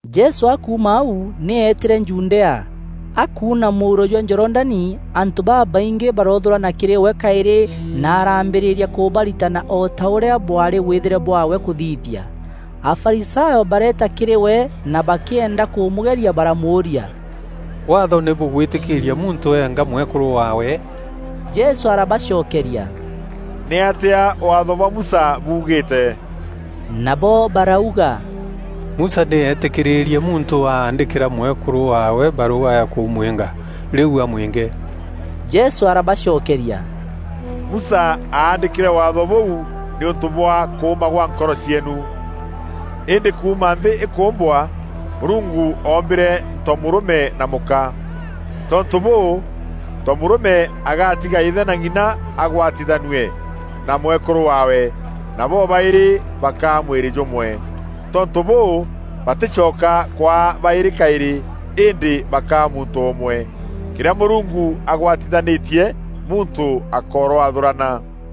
Jesû akuuma au nî eetîre Judea. Akuuna mûuro jwa Jorodani antû babaingî baroothûrana kîrî we kaîrî na araambîrîria kûbaritana o ta ûrîa bwaarî wîthîre bwaawe kûthithia. Afarisayo bareeta kîrî we na bakîenda kûmûgeria baramûûria, “Waatho nî bûgwîtîkîîria muntû eenga mwekûrû waawe?” Jesû arabacokeria, “Nîatîa Waatho bwa Musa buugîîte?” Nabo barauga, “Musa nî eetîkîrîîrie muntû aandîkîra mwekûrû waawe barûga ya kûmwînga rîu amwînge.” Jesû arabacokeria, “Musa aandîkîre Waatho bûu nîûntû bwa kûûma gwa nkoro cieenu. Îndî kuuma nthî îkûûmbwa, ‘Mûrungu oombîre ntomûrûme na mûka. Tontû bûû, ntomûrûme agatiga îthe na ng’ina agwatanithue na mwekûrû waawe, na bobaîrî bakaa mwîrî jûmwe. Tontû bûû, batîcoka kwaa baîrî kaîrî, îndî bakaa muntû ûmwe. Kîrîa Mûrungu agwatithanîtie muntû akoroathûrana.”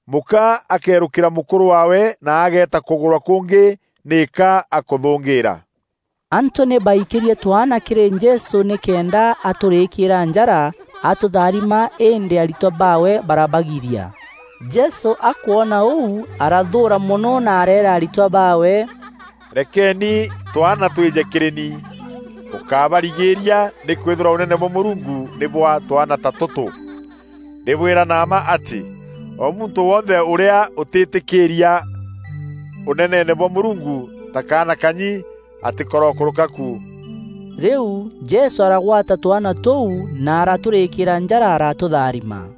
Mûka akeerûkîra mûkûrû waawe na ageeta kûgûrwa kûngî nîka akûthûngîîra.” Antû nî baikîrie twaana kîrî Jesû nîkenda aturîkîîra njara atûtharima îndî aritwa baawe barabagiria. Jesû akwona ûu, arathûûra mono na areera aritwa baawe, “Rekeeni twaana twîje kîrî ni. Bûkábarigîîria nîkwîthîrwa Ûnene bwa Mûrungu nî bwa twaana ta tûtû. Ndîbwîra na mma atî, o muntû wonthe ûrîa ûtîtîkîîria Ûneneene bwa Mûrungu ta kaana kanyi, atîkorokûrûka ku.” Rîu Jesû aragwata twaana tûu na aratûrîkîîra njara aratûtharima.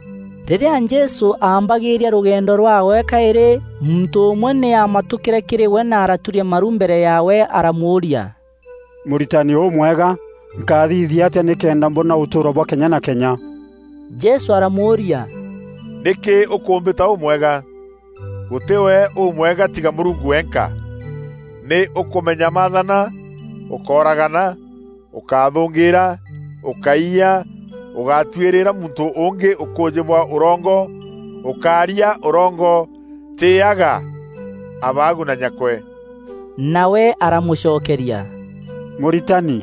Rîrîa Jesû aambagîîria rûgendo rwaawe kaîrî, muntû ûmwe nî aamatûkîre kîrî we na araturia maru mbere yaawe aramûûria, “Mûritani ûmwega, nkathithia atîa nîkenda mboona ûtûûro bwa kenya na kenya?” Jesû aramûûria, “Nîkî ûkûmbîta ûmwega? Gûtî we ûmwega tiga Mûrungu wenka. Nî ûkûmenya maathana: ‘Ûkóragana; ûkáthûngîîra; ûkáiya; ûgátwirîîra muntû ûngî ûkûûjî bwa ûrongo; ûkária ûrongo; tîîaga abaagu na nyakwe.’” Nawe aramûcokeria, “Mûritani,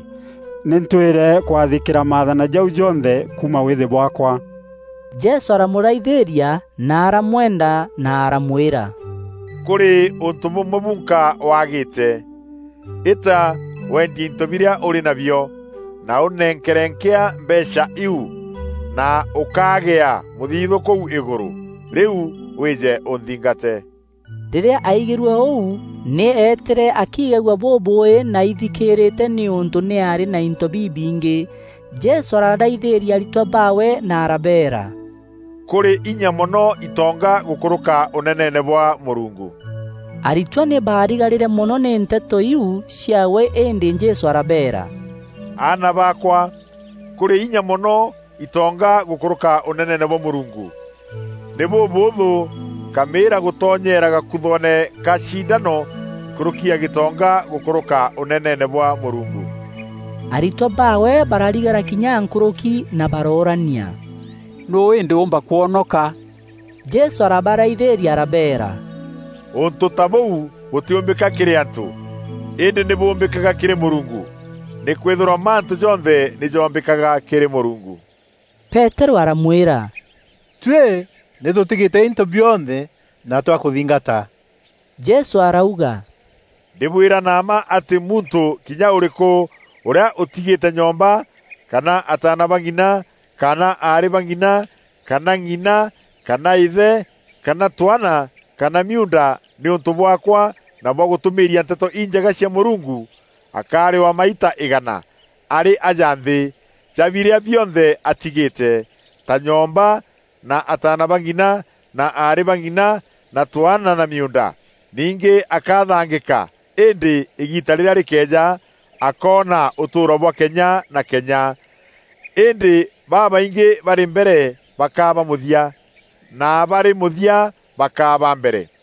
nî ntwîre kwathîkîra maathana jau jonthe kuuma wîîthî bwaakwa.” Jesû aramûraithîîria na aramwenda na aramwîra, “Kûrî ûntû bûmwe bunka waagîte. Îta wendie into birîa ûrî nabio, na ûnenkere nkîa mbeecha iu, na ûkagîa mûthithû kûu îgûrû, rîu wîîje ûnthingate.” Rîrîa aigîrue ûu, nî eetîre akiigagua bûbûûî na aithikîrîte nîûntû nî aarî na into bibingî. Jesû araraithîîria aritwa baawe na arabeera, “Kûrî inya mono itonga gûkûrûka Ûneneene bwa Mûrungu.” Aritwa nî barigarîre mono nî nteto iu ciaawe îndî Jesû arabeera, “Aana baakwa, kûrî inya mono itonga gûkûrûka Ûneneene bwa Mûrungu! Nî bûbûûthû nkamîîra gûtonyeera gakuthoone ka cindano nkûrûki ya gîtonga gîkûrûka Ûneneene bwa Mûrungu.” Aritwa baawe bararigara kinya nkûrûki na baroorania, “Nûû îndî ûûmba kwonoka?” Jesû arabaraithîîria arabeera, “Ûntû ta bûu bûtîûmbîka kîrî antû, îndî nî bûûmbîkaga kîrî Mûrungu. Nîkwîthîrwa mantû jonthe nî joombîkaga kîrî Mûrungu.” Peterû aramwîra, “Tuî nî tûtigîte into bionthe na twakûthingata!” Jesû arauga, “Ndîbwîra na mma atî muntû kinya ûrîkû ûrîa ûtigîte nyomba kana ataana ba ng'ina kana aarî ba ng'ina kana ng'ina kana îthe kana twaana kana miuunda nîûntû bwaakwa na bwa gûtûmîîria Nteto Injega cia Mûrungu, akarîwa maita îgana, arî aja nthî, ja birîa bionthe atigîte: ta nyomba na ataana ba ng'ina na aarî ba ng'ina na twaana na miuunda. Ningî akathangîka îndî îgiita rîrîa rîkeeja akoona ûtûûro bwa kenya na kenya. Îndî babaingî barî mbere bakaa ba mûthia, na barî mûthia bakaa ba mbere.”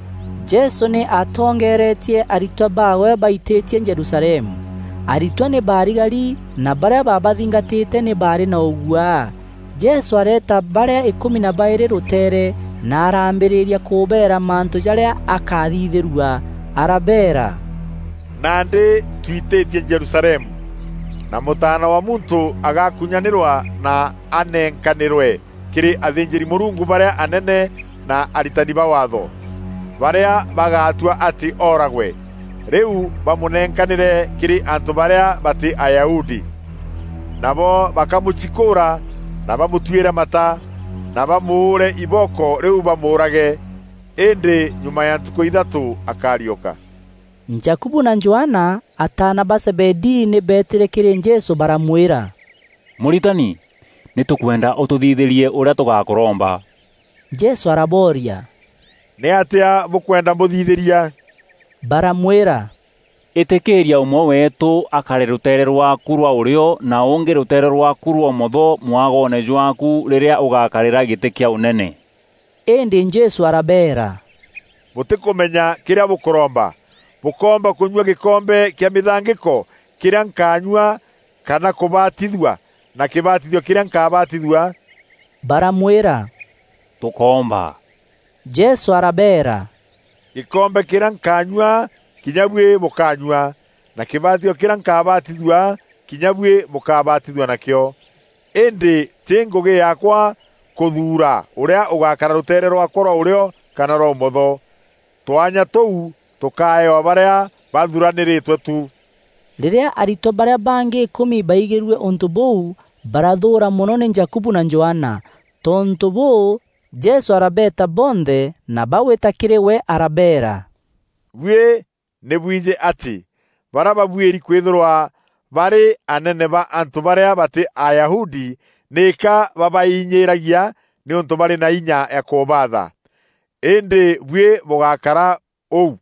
Jesû nî aatongeeretie aritwa baawe baitîtie Jerusalemu. Aritwa nî baarigari na barîa baabathingatîte nî baarî na ûguaa. Jesû areeta barîa îkûmi na baîrî rûteere na araambîrîria kûbeera mantû jarîa akaathithîrua. Arabeera, “Nandî twitîtie Jerusalemu, na Mûtaana wa Muntû agakunyanîrwa na anenkanîrwe kîrî athînjîri-Mûrungu barîa anene na aritani ba Waatho, barîa bagaatua atî ooragwe, rîu bamûnenkanîre kîrî antû barîa batî Ayahudi. Nabo bakamûcikûûra na bamûtuîre mata, na bamûûre ibooko rîu bamûûrage. Îndî nyuma ya ntukû ithatû akariûka.” Jakubu na Johana, ataana ba Zebedii, nî beetîre kîrî Jesû baramwîra, “Mûritani, nî tûkwenda ûtûthithîrie ûrîa tûgakûromba.” Jesû arabooria, “Nîatîa bûkwenda mbûthithîria?” Baramwîra, “Îtîkîra ûmwe weetû akare rûteere rwaakû rwa ûrîo na ûngî rûteere rwaaku rwa ûmotho mwagoone jwaaku rîrîa ûgakarîra gîtî kîa Ûnene.” Îndî Jesû arabeera, “Bûtîkûmenya kîrîa bûkûromba. Bûkoomba kûnyua gîkombe kîa mîthangîko kîrîa nkaanyua kana kûbatithua na kîbatithio kîrîa nkabatithua?” Baramwîra, “Tûkoomba.” Jesû arabeera, “Gîkombe kîrîa nkaanyua kinya buî bûkaanyua, na kîbatithio kîrîa nkabatithua kinya buî bûkabatithua nakîo. Îndî, tî ngûgî yaakwa kûthuura ûrîa ûgakara rûteere rwaakwa rwa ûrîo kana rwa ûmotho. Twanya tûu tûkaeewa barîa baathuranîrîtwe tu.” Rîrîa aritwa barîa bangî îkûmi baigîrue ûntû bûu, barathûûra mono nî Jakubu na Johana. Tontû bûû, Jesû arabeeta bonthe na bagwîta kîrî we arabeera, “Buî nî bwijî atî barîa babuîri kwîthîrwa baarî anene ba antû barîa batî Ayahudi nîka babainyîragia nîûntû barî na inya ya kûbaatha. Îndî buî bûgákara ûu.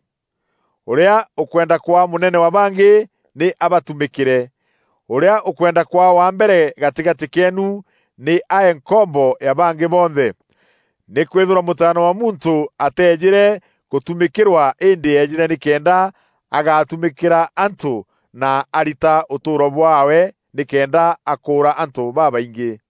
Ûrîa ûkwenda kwaa mûnene wa bangî, nî abatumîkîre. Ûrîa ûkwenda kwaa wa mbere gatîgatî keenu nî ae nkombo ya bangî bonthe. Nîkwîthîrwa Mûtaana wa Muntû ateejîre gûtumîkîrwa îndî eejîre nîkenda agatumîkîra antû na arita ûtûûro bwaawe nîkenda akûûra antû babaingî.”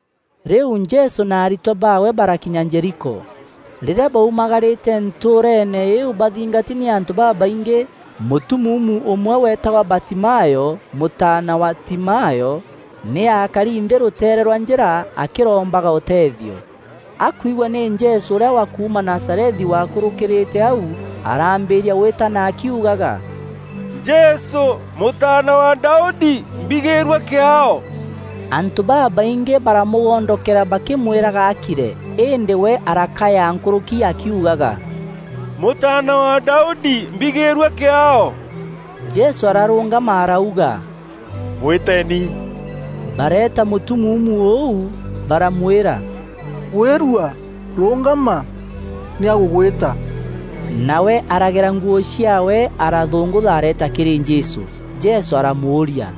Rîu Jesû na aritwa baawe barakinya Jeriko. Rîrîa baumagarîte, ntûûreene îîu bathingati nî antû babaingî, mûtumuumu ûmwe weetagwa Batimayo, mûtaana wa Timayo, nî aakari nthî rûteere rwa njîra akîrombaga ûteethio. Akwigua nî Jesû ûrîa wa kuuma Nazarethi waakûrûkîrîîte au, araambîria gwîtana akiugaga, “Jesû! Mûtaana wa Daudi! Mbigîîrua kîaao!” Antû babaingî baramûgondokera bakîmwîraga akire, îndî we arakaya nkûrûki akiugaga, “Mûtaana wa Daudi, mbigîîrua kîaao.” Jesû ararûngama arauga, “Mwîteeni.” Bareeta mûtumuumu ûu, baramwîra, “Gwîrua! Rûngama, nî agûgwîta.” Nawe aragera nguû ciaawe, arathûngûtha areeta kîrî Jesû. Jesû aramûûria,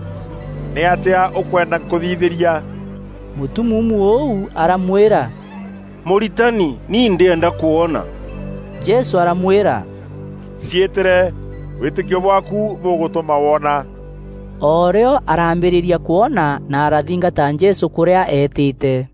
“Nîatîa ûkwenda nkûthithîria?” Mûtumuumu ûu aramwîra, “Mûritani, ni ndîenda kwona.” Jesû aramwîra, “Ciîtîre, wîtîkio bwaaku bûgûtûma woona.” O rîo arambîrîria kwona na arathingata Jesû kûrîa eetîte.